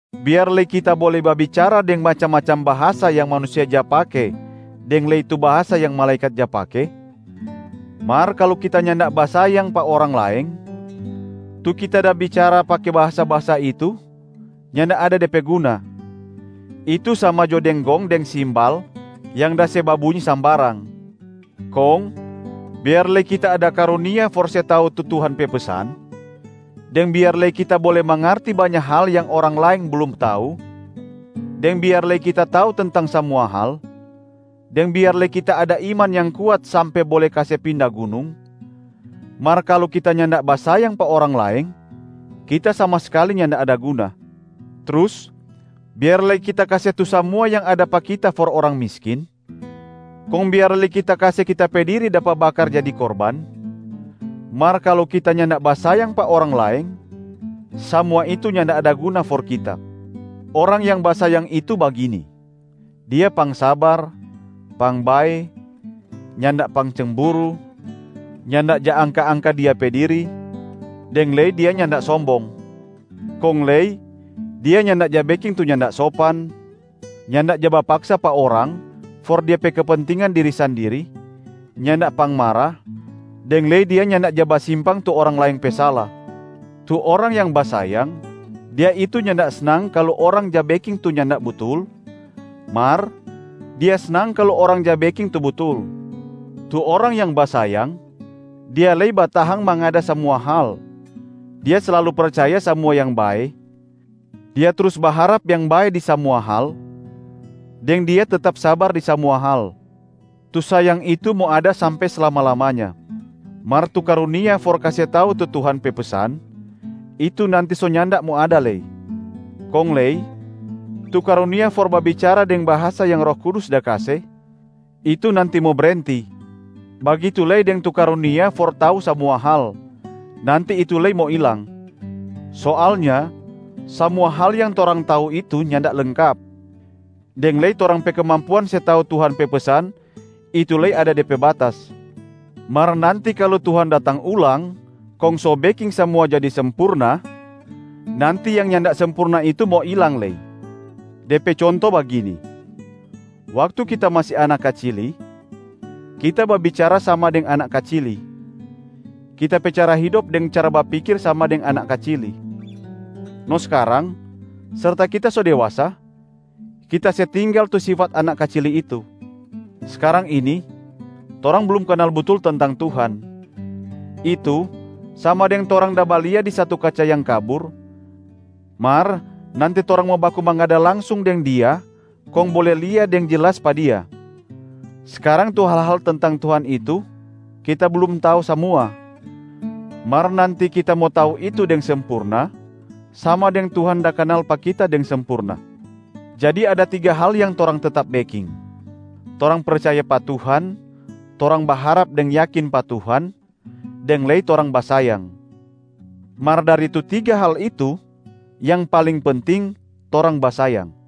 Biar lei kita bole babicara deng macam-macam bahasa yang manusia ja pake deng lei tu bahasa yang malaekat ja pake, mar kalu kita nyanda basayang pa orang laeng, tu kita da bicara pake bahasa-bahasa itu nyanda ada de pe guna, itu sama jo deng gong deng simbal yang da se babunyi sambarang. Kong biar lei kita ada karunia for se tau tu Tuhan pe pesan, deng biar lei kita bole mangarti banya hal yang orang laeng blum tau, deng biar lei kita tau tentang samua hal, deng biar lei kita ada iman yang kuat sampe bole kase pinda gunung, mar kalu kita nyanda basayang pa orang laeng, kita sama skali nyanda ada guna. Trus biar lei kita kase tu samua yang ada pa kita for orang miskin, kong biar lei kita kase kita pe diri dapa bakar jadi korban, mar kalu kita nyanda basayang pa orang laeng, samua itu nyanda ada guna for kita. Orang yang basayang itu bagini: dia pangsabar, pangbae, nyanda pangcemburu, nyanda ja angka-angka dia pe diri, deng lei dia nyanda sombong. Kong lei dia nyanda ja beking tu nyanda sopan, nyanda ja bapaksa pa orang for dia pe kepentingan diri sandiri, nyanda pangmara, deng lei dia nyanda ja basimpang tu orang laeng pe sala. Tu orang yang basayang, dia itu nyanda snang kalu orang ja beking tu nyanda butul, mar dia snang kalu orang ja beking tu butul. Tu orang yang basayang, dia lei batahang mangada samua hal, dia slalu percaya samua yang bae, dia trus baharap yang bae di samua hal, deng dia tetap sabar di samua hal. Tu sayang itu mo ada sampe slama-lamanya. Mar tu karunia for kase tau tu Tuhan pe pesan, itu nanti so nyanda mo ada lei. Kong lei tu karunia for babicara deng bahasa yang Roh Kudus da kase, itu nanti mo brenti. Bagitu lei deng tu karunia for tau samua hal, nanti itu lei mo ilang. Soalnya samua hal yang torang tau itu nyanda lengkap, deng lei torang pe kemampuan se tau Tuhan pe pesan, itu lei ada de pe batas. Mar nanti kalu Tuhan datang ulang kong so beking samua jadi sempurna, nanti yang nyanda sempurna itu mo ilang lei. De pe conto bagini: waktu kita masi anak kacili, kita babicara sama deng anak kacili, kita pe cara hidop deng cara bapikir sama deng anak kacili. No skarang, serta kita so dewasa, kita se tinggal tu sifat anak kacili itu. Skarang ini, torang blum kanal butul tentang Tuhan, itu sama deng torang da balia di satu kaca yang kabur, mar nanti torang mo baku mangada langsung deng Dia kong bole lia deng jelas pa Dia. Skarang tu hal-hal tentang Tuhan itu kita blum tau samua, mar nanti kita mo tau itu deng sempurna sama deng Tuhan da kanal pa kita deng sempurna. Jadi ada tiga hal yang torang tetap beking: torang percaya pa Tuhan, torang baharap deng yakin pa Tuhan, deng lei torang basayang. Mar dari tu tiga hal itu, yang paling penting, torang basayang.